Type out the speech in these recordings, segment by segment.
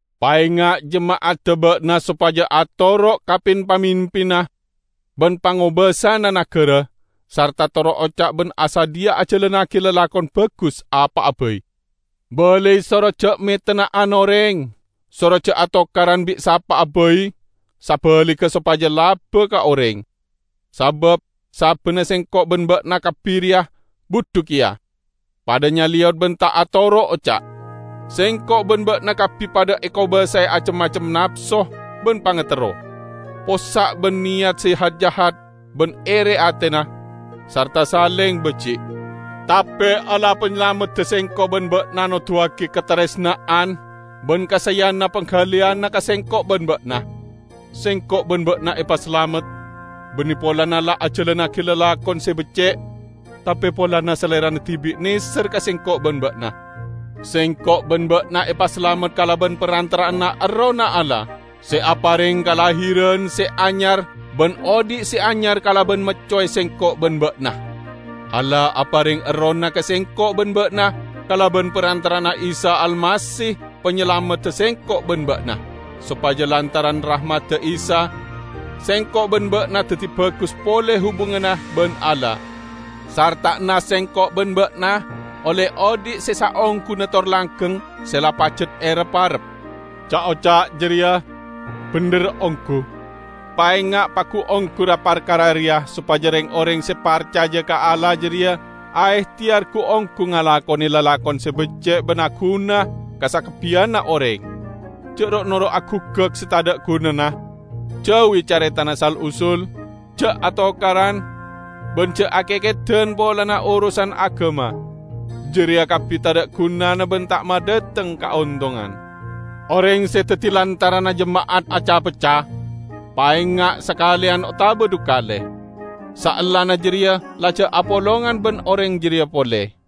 Paenga' jema'adda ba'na sopaja atoro' ka pin-pamimpinna ban pangobasana nagara, sarta toro' oca' ban asadhiya ajalannagi lalakon bagus apa'a bai. Balai soro ja' metenna'an oreng, soro ja' atokaran bi' sapa'a bai, sabaligga sopaja laba ka oreng. Sabab sabbanna sengko' ban ba'na kabbi reya budhu keya, padha nyaleyot ban ta' atoro' oca'. Sengko' ban ba'na kabbi padha ekobasae acem-macem napso ban pangaterro; possa' ban neyat se hat-jahat ban ere atena, sarta saleng baji'. Tape Allah Panyalamedda sengko' ban ba'na noduwagi kataresna'an ban kasaeyanna panggaliyanna ka sengko' ban ba'na. Sengko' ban ba'na epasalamet, banne polana la ajalannagi lalakon se becce', tape polana Salerana dibi' neser ka sengko' ban ba'na. Sengko' ban ba'na epasalamet kalaban parantara'anna Errohna Allah, se apareng kalahiran se anyar ban odhi' se anyar kalaban maccowe sengko' ban ba'na. Allah apareng Errohna ka sengko' ban ba'na kalaban parantara'anna Isa Almasih Panyalamedda sengko' ban ba'na, sopaja lantaran rahmadda Isa, sengko' ban ba'na daddi bagus pole hubunganna ban Allah, sarta'anna sengko' ban ba'na olle odhi' se saongguna tor langgeng se la pajat erep-arep. Ca'-oca' jareya bendher onggu. Paenga' pagu-onggu ra-parkara reya sopaja reng-oreng se parcaja ka Allah jareya aehteyar gu-onggu ngalakone lalakon se becce' ban aguna ka sakabbiyanna oreng. Ja' ro'-noro' aguggak se tadha' gunana, jauwi caretana sal-usul, ja' atokaran, ban ja' akekedan polana orosan agama. Jareya kabbi tadha' gunana ban ta' madhateng kaontongan. Oreng se daddi lantaranna jema'at aca-pecca, paenga' sakaleyan otaba dhukale. Saellana jareya la ja' apolongan ban oreng jareya pole.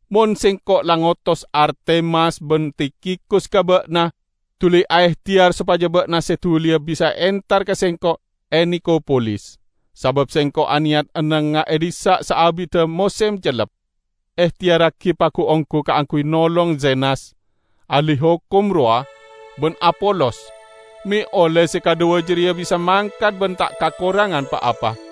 Mon sengko' la ngotos Artemas ban Tikhikus ka ba'na, duli aehteyar sopaja ba'na se duliya bisa entar ka sengko' e Nikopolis, sabab sengko' aneyat ennengnga e dhissa' saabidda mosem cellep. Ehteyarragi pagu-onggu kaangguy nolong Zenas, ahli hokom rowa, ban Apolos, me' olle se kadhuwa jareya bisa mangkat ban ta' kakorangan pa-apa.